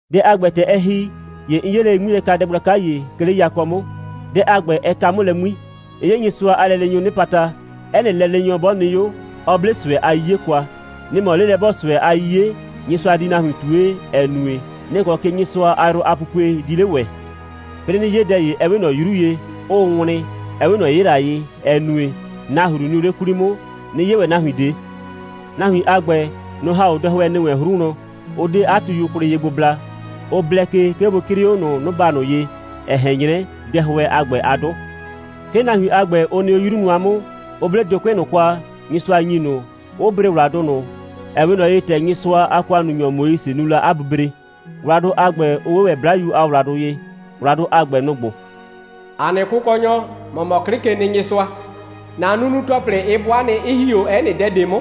Dɛ a ‑gbɛ, ‑tɛ ɛ ‑hi, ‑ye 'n 'ye lele 'ŋmilɛkadɛ gblaka ‑ye, 'ke 'le yakɔ 'mʋ. Dɛ a ‑gbɛ, ɛ ka 'mʋ lɛ 'ŋmi. 'N 'ye Nyɩsʋa a lɛleenyʋʋ 'nɩpata, 'ɛ nɩ lɛleenyɔ 'bɔ nɩ 'o, 'ɔ 'ble ꞊sʋɛ a 'yiye kwa. Nɩ‑ mɔ 'lelɛ'bɔɔ꞊sʋɛ a 'yiye, Nyɩsʋa di nahuin ꞊tue, ‑ɛ nue, nɩ‑ kɔ ke Nyɩsʋa a yrʋ a pupue di 'le ‑wɛ. 'Plɩɩ 'nɩ 'ye dɛ ‑ye, 'ɛ 'we ꞊nɔ 'yru ye, 'ʋʋ wlɩn, ‑ɛ 'we ꞊nɔ 'yɩla ye, ‑ɛ nue, nahru nɩʋ 'le 'kwli 'mʋ; 'nɩ 'ye ‑wɛ nahuin ꞊de. Nahuin a ‑gbɛ, nʋ‑ ‑ha 'o dɛhʋɛ ‑nɩ wɛn 'hru wlɔn, 'ʋ 'de 'a tuyu kwlɩ ye gbo bla, 'ʋ blɛ ke, 'ke bʋ 'crɩɩ 'o ꞊nʋ 'noba ꞊nʋ ye, ‑ɛ ꞊hɛn 'nyrɛ dɛhʋɛ a ‑gbɛ a 'dʋ. 'Ke nahuin a ‑gbɛ, ʋ nɩ 'o 'yru nʋa 'mʋ, 'ʋ 'ble dʋkʋɩ' ꞊nʋ kwa, Nyɩsʋa ‑nyi ꞊nʋ, 'ʋ bre ‑wladʋ ꞊nʋ, ‑ɛ 'we ꞊nɔ ye, ‑tɛ Nyɩsʋa a ‑kʋannunyɔ Moise nu la 'a bubre; ‑wladʋ a ‑gbɛ 'ʋ 'we ‑wɛ 'Blayu a ‑wladʋ ye. ‑Wladʋ a ‑gbɛ, nʋ‑ ‑gbo: «‑A nɩ Kʋkɔnyɔ, ‑mɔ mɔ 'Klɩkenɩnyɩsʋa. ‑Na nunu‑tɔplɩ, ɩ 'bʋa nɩ, 'ɩ ‑hi 'o 'ɛ nɩ dɛ ꞊de 'mʋ.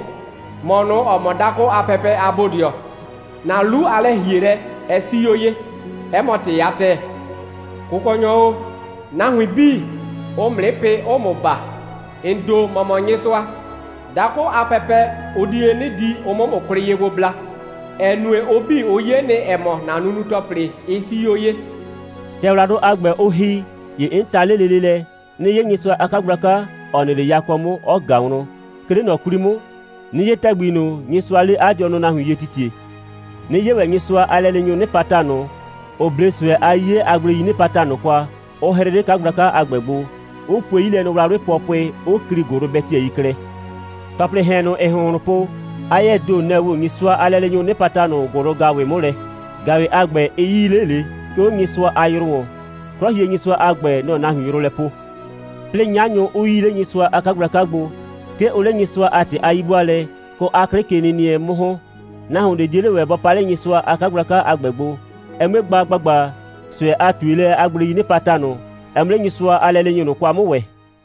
‑Mɔ ꞊nʋ, ‑ɔ mɔ dakʋ a pɛpɛ a Bodɩɔ, ‑na 'lu a lɛ‑hielɛ, ɛ 'sii 'o ye, 'ɛ mɔ ‑tɩ a ‑tɛɛ. Kʋkɔnyɔ o, nahuin 'bii, ʋʋ ‑mʋ 'nɩ pɩ, 'ʋʋ ‑mʋ baa. ‑N ‑do, ‑mɔ mɔ Nyɩsʋa. Dakʋ a pɛpɛ, ʋ di 'le 'nɩ di, ʋ 'mʋ ‑mʋ kwlɩ ye gbo bla, ‑ɛ nue, ʋ 'bii, ʋ 'ye nɩ, ‑ɛ mɔ, ‑na nunu‑tɔplɩ, ɩ 'sii 'o ye.» ‑Tɛ ‑wladʋ a ‑gbɛ, ʋ ‑hi, ‑ye 'n ta 'le lele lɛ, 'nɩ 'ye Nyɩsʋa a 'kagblaka, ‑ɔ nɩ 'le yakɔ 'mʋ, 'ɔ ꞊ga wlɔn, 'ke 'le ꞊nɔ 'kwli 'mʋ, 'nɩ 'ye ‑tɛgbi ꞊nʋ, Nyɩsʋaa 'le 'a dɩɔnʋ nahuin ye titiee, 'nɩ 'ye ‑wɛ Nyɩsʋa a lɛleenyʋʋ 'nɩpata ꞊nʋ, ‑ʋ 'ble ꞊sʋɛ a 'yiye a gbleii 'nɩpata ꞊nʋ kwa, 'ʋ 'hrɩ 'le 'kagblaka a ‑gbɛ gbo, 'ʋ pue 'yilɛnɔwlawlɩ pʋɔpʋɩ, 'ʋ klii ‑gʋlʋbɛtɩyɛi klɛ. ‑Tɔplɩɩ ‑hɛn ꞊nʋ, ‑ɩɩ ‑hʋnhlʋn po, 'a 'yɛɛ ‑do, nɛ‑ woo Nyɩsʋa a lɛleenyʋʋ 'nɩpata ꞊nʋ ‑gʋlʋ‑gaʋwɩ 'mʋ lɛ. ‑Gaʋwɩ a ‑gbɛ, ɩ 'yii 'le ꞊le, 'ke 'o Nyɩsʋa a yrʋ ‑wɔn. 'Klɔhienyɩsʋa a ‑gbɛ, nɔ‑ɔ nahuin yrʋ lɛ poo. 'Plɩɩ 'nyanyʋ 'ʋ 'yii 'le Nyɩsʋa a 'kagblaka gbo. 'Ke ʋʋ 'le Nyɩsʋa a ‑tɩ a 'yi'bʋaalɛ kɔ 'a 'klɩkenɩnɩɛ 'mʋ ‑hɔn. Nahuon ꞊de 'die 'le ‑wɛ bɔ pa 'le Nyɩsʋa a 'kagblaka a ‑gbɛ gbo, ɛ 'mue gba ‑gbagba, ꞊sʋɛ a ꞊tuelɛ a gbleii 'nɩpata ꞊nʋ, ɛ 'mʋ 'le Nyɩsʋa a lɛleenyʋ ꞊nʋ kwa 'mʋ ‑wɛ.